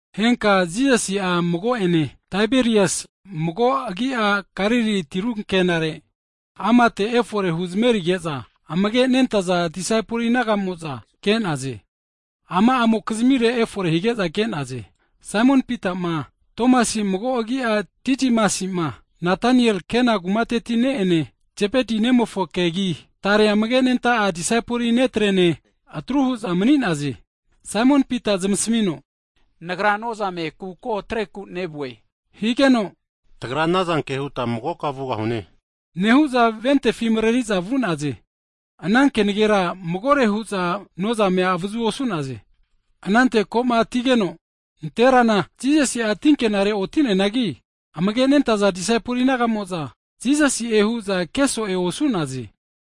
Henka'a Jisasi'a mago'ene Taberiasi mago agi'a Galili tiru ankenare, amate efore huzmerige'za amage' nentaza disaipol naga'amo'za ke'naze. Ama'amokizmire efore hige'za ke'naze. Saimon Pita'ma, Tomasi mago agi'a Didimasi'ma, Natanael Kana kumateti ne'ene, Zebeti nemofokegi, tare amage' nenta'a disaipol netrene atru hu'za mani'naze. Saimon Pita'a zamasmino, nagra nozame kuko atreku nevue hige'za, tagra anazanke huta magoka vugahune, nehu'za votifi mareri'za vu'naze. Ana kenagera magore hu'za nozamea avazu osu'naze. Anante ko'ma atigeno, nanterana Jisasi'a tinkenare oti'neanagi, amage nentaza disaipol naga'mo'za, Jisasi'e hu'za keso'e osu'naze.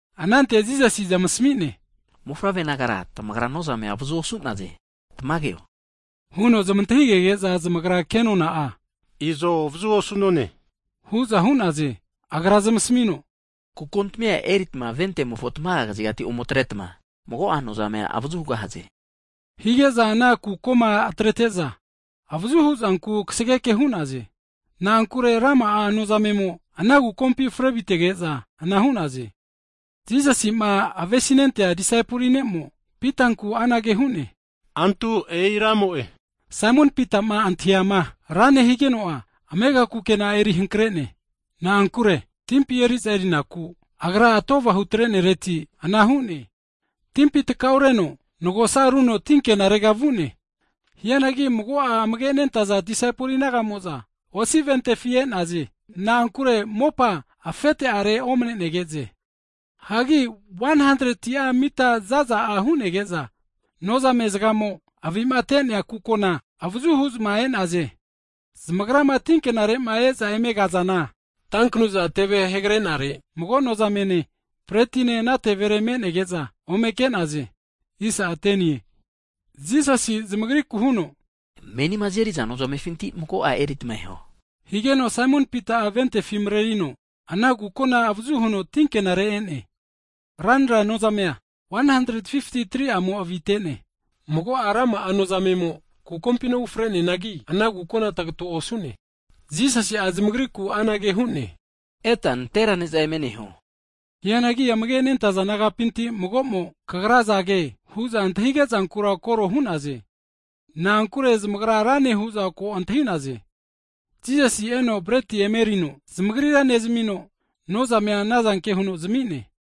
Anante Jisasi'a zamasmi'ne, Mofavre nagare tamagra nozamea avazu osu'naze, tamageo? Huno zamantahigege'za, zamagra ke nona'a Izo avazu osu'none, hu'za hu'naze. Agra zamasamino, Kukontamia eritma votimofo tamaga kazigati omo atretma, mago'a nozamea avazu hugahaze. Hige'za ana kukoma atrete'za, avazu hu'zanku kasgeke hu'naze. Na'ankure rama'a nozamemo ana kukompi frevitege'za avazuhu anaga ana votifi atrezanku hu'naze. Jisasi'ma avesi nentea disaipol ne'mo Pitanku anage hu'ne, antu e'i Ramo'e! Saimon Pita'ma antahiama Rane higeno'a, amega kukena'a eri hankre'ne, (na'ankure timpi eri'za erinaku agra atova hutre'nereti ana hu'ne), timpi tkaureno nagosa runo ti ankenarega vu'ne. Hianagi mago'a amage' nentaza disaipol naga'mo'za votifi e'naze. Na'ankure mopa afete'are omane'negeze. Hagi 100'a mita zaza'a hu'nege'za nozame zagamo avi'ma te'nea kukona avazu huzma e'naze. Zamagrama tinkenare e'za eme kazana tanknuza (sakol) teve hegre'nare, mago nozamene, breti'ne ana tevere menege'za ome ke'naze. Jisasi'a zamagriku huno, Menima azeri'za nozamefinti mago'a eritma eho. Higeno Saimon Pita'a votifi marerino ana kukona avazu huno tinkenare e'ne. Ranra nozamea 153'amo avite'ne, mago'a rama'a nozamemo kukompina ufre'neanagi, ana kukona tagato osu'ne. Jisasi'a zamagriku anage hu'ne, Eta nantera ne'za eme neho. Hianangi amage' nentaza disaipol nagapinti mago'mo, Kagra azage, hu'za antahige'zankura koro hu'naze, na'ankure zamagra Rane hu'za ko antahi'naze. Jisasi'a eno breti emerino zamagrira nezmino, nozamea anazanke huno zami'ne.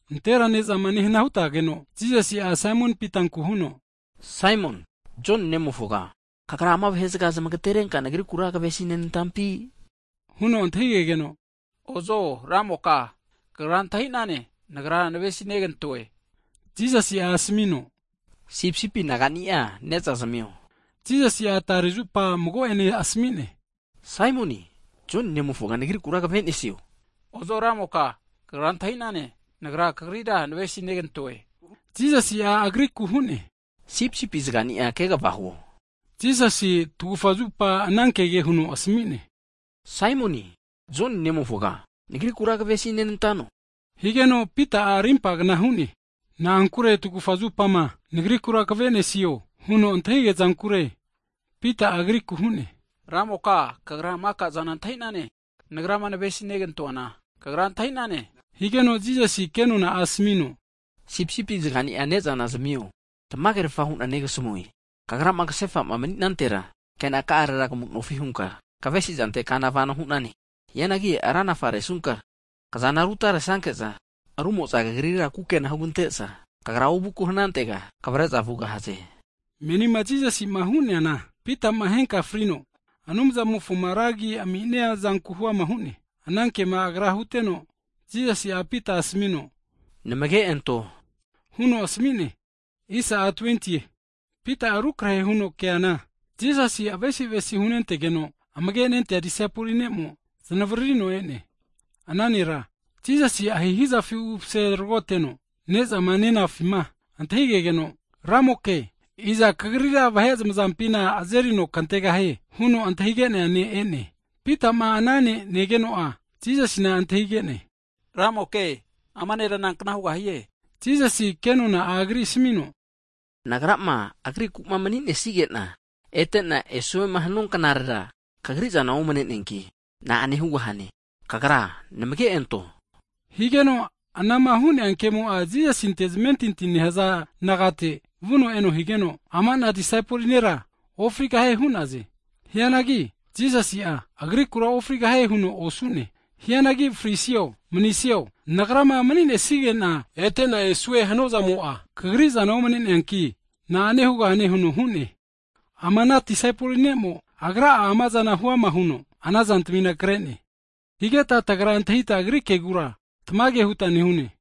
Nantera ne'zama nehna hutageno, Jisasi'a Saimon Pitanku huno, Saimon, Joni nemofoga, kagra ama vahe'zaga zamagterenka Nagrikura kvesinenantampi? Huno antahi'gegeno, Ozo Ramoka, Kagra antahi'nane, nagra navesi negantoe. Higeno Jisasi'a asmino, Sipisipi nagani'a ne'za zamio. Jisasi'a tare zupa mago'ene anage huno asmi'ne, Saimoni, Joni nemofoga, Nagrikura kave'nesio? Ozo, Ramoka, Kagra antahi'nane nagra Kagrira navesi negantoe, higeno Jisasi agriku huno, Sipisipi zaga'ni'a kegava huo. Higeno Jisasi'a tagufa zupa ana kege huno asmi'ne, Saimon, Joni nemofoga, Nagrikura kavesi nenantano? Higeno Pita'a arimpa kna hu'ne, na'ankure tagufa zupama Nagrikura kve'nesio? Huno antahigea zankure. Pita'a Agriku hu'ne, Ramoka, Kagra maka'zana antahi'nane. Nagrama navesi negantoana Kagra antahi'nane. Higeno Jisasi'a ke nona'a asmino, Sipisipi zaga'ni'a ne'zana zamio hu'ne. Tamagerfa hu'na negasamue, Kagrama kahefa'ma mani'nantera kenakarera kamu'nofi hunka kavesi'zante kana vano hu'nane, hianagi ranafa resunka, kazana rutaresanke'za rumo'za kagrira kukena hugante'za, ovuku hanantega kavare'za vugahaze. (Menima Jisasi'ma hu'neana, Pitama henka frino Anumzamofoma ra agi ami'nia zanku huama hu'ne.) Ana kema Agra huteno, Jisasi'a Pita asmino, Namage anto! Huno asmi'ne. Hagi Pita'a rukrahe huno keana, Jisasi'ma avesi avesi hunentegeno amage' nentea disaipoli ne'mo znavaririno e'ne. Ana nera Jisasi ahihi'zafi umase tragoteno ne'zama nenafima antahigeno, Ramoke, iza Kagrira vahe zamazampina kazerino antegahie? Huno antahige'nea ne' e'ne. Pita'ma ana ne' negeno'a, Jisasina antahige'ne, Ramoke, ama nera nankna hugahie? Jisasi'a ke nona'a agrira asmino, Nagrama, Agriku mani'nesige'na ete'na esuema hanua knarera, kagri'zana omne'neanki, na'ane hugahane? Kagra namage anto! Higeno anama hu'nea kemo'a Jisasinte zamentinti nehaza nagate vuno eno higeno, ama'na disaipol nera ofrigahie hu'naze. Hianagi Jisasi'a, agrikura ofrigahie huno osu'ne, Hianagi frisio manisio Nagrama mani'nesigena e'tena esue hanuazamo'a kagri'zana omne'neanki, na'ane hugahane? huno hu'ne. Ama'na disaipol ne'mo agra'a amazana huama huno ana zantamina kre'ne, higeta tagra antahita agri kegura (testimoni) tamage huta nehune.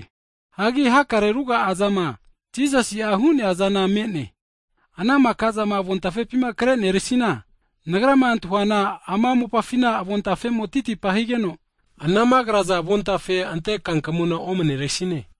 Hagi hakare ruga'a zama Jisasi'a hu'nea zana me'ne, ana maka'zama avon tafepima kre'neresina, nagrama antahuana ama mopafina avon tafemo'a titipa higeno, anama kraza avontafe ante kankamuna omaneresine.